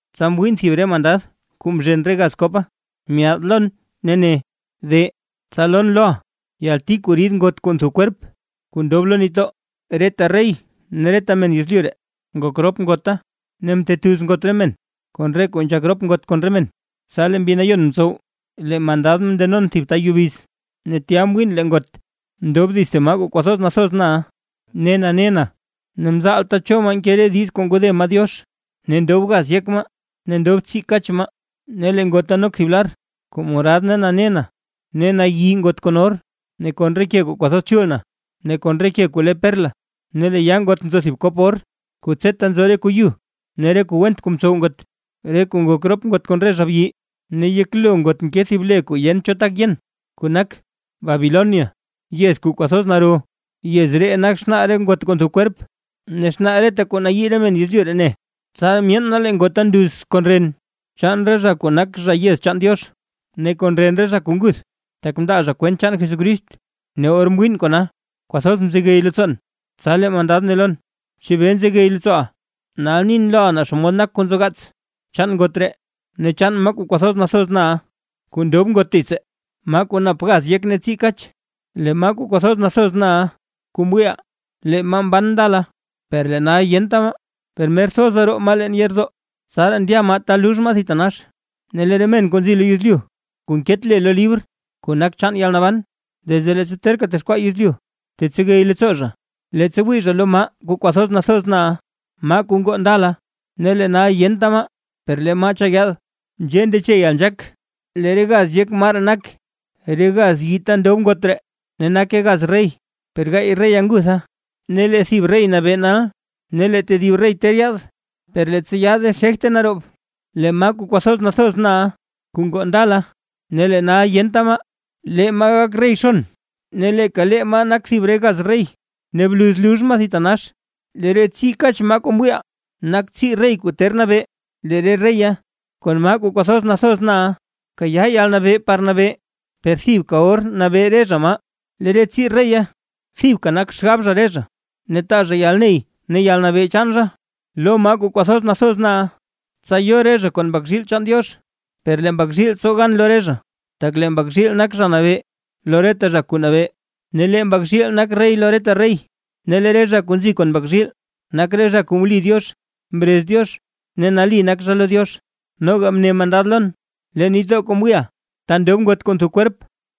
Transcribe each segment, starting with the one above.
Tsa mwiin thib re mandad kuu mzhen re gaz kopa, myaad lon ne ne: ―De, tsa lon loʼa yalti kuu rid ngot kuu ntho kwerp kuu ndob lo nitdoo. Reta rey ne reta men yezlyu ree, ngok rop ngota, ne mtetuz ngot re men, kon re kuu nzhak rop ngot kon re men. Tsa lee Mbi Nayon mtsow lee mandad mndenon thib ta yubiz, ne tya mwiin lee ngot, ndob dits thib maa kwathoz nathoz na ne nane na, ne mzaalta cho maa nke re diiz kuu ngode maa Diox, ne ndob gaz yek maa ne ndob tsii kach maa. Ne lee ngota nok thib lar kuu morad ne nane na, ne nayi ngot kon or ne kon re ke kuu kwathoz chul na, ne kon re ke kuu le perla. Ne lee yaa ngot nzo thib kop or, kuu tseta nzo re kuu yu ne re kuu went kuu mtsow ngot, re kuu ngok rop ngot kon re zha byi; ne yeklo ngot nke thib le kuu yent cho tak yen, kuu nak: “Babilonia, yez kuu kwathoz naro, yez ree nak xnaa re ngot kuu ntho kwerp, ne xnaa reta kuu nayii re men yezlyu ree ne”. Tsaraa myeen na lee ngota nduz kon ren chaan re zha kuu nak zha yez chaan Diox, ne kon ren re zha kuu nguth, tak mndaa zha kwent chaan Jesucrist. Ne or mwiin kona, kwathoz mzegey leettsoon. Tsa lee mandad ne lon: ―¿Chebee nzegey leettsooʼa? Nal nin loʼa naa xomod nak kuu nzogaats, chaan ngot ree ne chaan maa kuu kwathoz nathoz na kuu ndob ngot dits, maa kuu nap gaz yek ne tsii kach. Lee maa kuu kwathoz nathoz na kuu mwiiʼa, lee maa mban ndala, per lee nal yenta maa; per mer thoza roo maa leen yeerdoo, tsaraa ndya maa ta lux maa thitanax. Ne lee re men kuu nzi lo yezlyu kuu nket le lo libr kuu nak chaan yalnaban, desde leettsa terka texkwaa yezlyu, tetsegey leettsoo zha, leettsa wii zha lo maa kuu kwathoz nathoz na, maa kuu ngoo ndala, ne lee nal yenta maa, per lee maa cha yaad. ’Nzhee ndeche yalnzhaak: Lee re gaz yek maa ree nak: Re gaz yii ta ndob ngot ree ne nake gaz rey; lee gaay reya ngutha; ne lee thib rey nabee nal, ne lee tedib rey ter yaad, per leettsa yaade xegte naroob. Lee maa kuu kwathoz nathoz na, kuu ngoo ndala ne lee nal yenta maa, lee maa gak rey xon ne leeka lee maa nak thib re gaz rey, ne bluz lux maa thitanax. ’Lee re tsii kach maa kuu mwiiʼa, nak tsii rey kuu ter nabee; lee re reya kon maa kuu kwathoz nathoz na kayaa yalnabee par nabee, per thibka or nabee re zha maa. Lee re tsii reya thibka nak xgab zha re zha, ne taa zha yalney ne yalnabee chaan zha lo maa kuu kwathoz nathoz na. Tsa yo re zha kon Mbak zhiil chaan Diox, per lee Mbak zhiil tsow gan lo re zha; tak lee Mbak zhiil nak Zha Nabee lo reta zha kuu nabee, ne lee Mbak zhiil nak rey lo reta rey. Ne lee re zha kuu nzi kon Mbak zhiil, nak re zha kuu mli Diox, mrez Diox ne nali nak zha lo Diox. Noga mne mandada lon: ―Lee nitdoo kuu mwiiʼa, ta ndob ngot kuu ntho kwerp,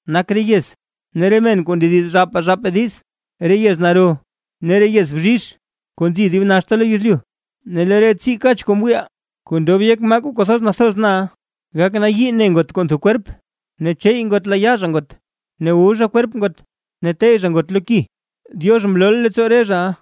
nak re yez, ne re men kuu ndediz zhaapaa zhaapaa diiz, re yez naro ne re yez bzhizh kuu nzi dib naxta lo yezlyu. Ne lee re tsii kach kuu mwiiʼa, kuu ndob yek maa kuu kwathoz nathoz na, gak nayii ne ngot kuu ntho kwerp, ne cheey ngot layaa zha ngot; ne wu zha kwerp ngot ne tey zha ngot lo ki. Diox mlooʼa leettsoo re zhaʼa,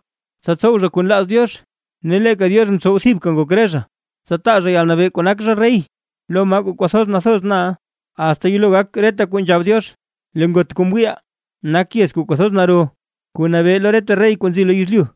tsa tsow zha kuu nlaaz Diox, ne leeka Diox mtsow thibka ngok re zha, tsa taa zha yalnabee kuu nak zha rey lo maa kuu kwathoz nathoz na, asta yelo gak reta kuu nzhab Diox. Lee ngot kuu mwiiʼa, nak yez kuu kwathoz naro kuu nabee lo reta rey kuu nzi lo yezlyu.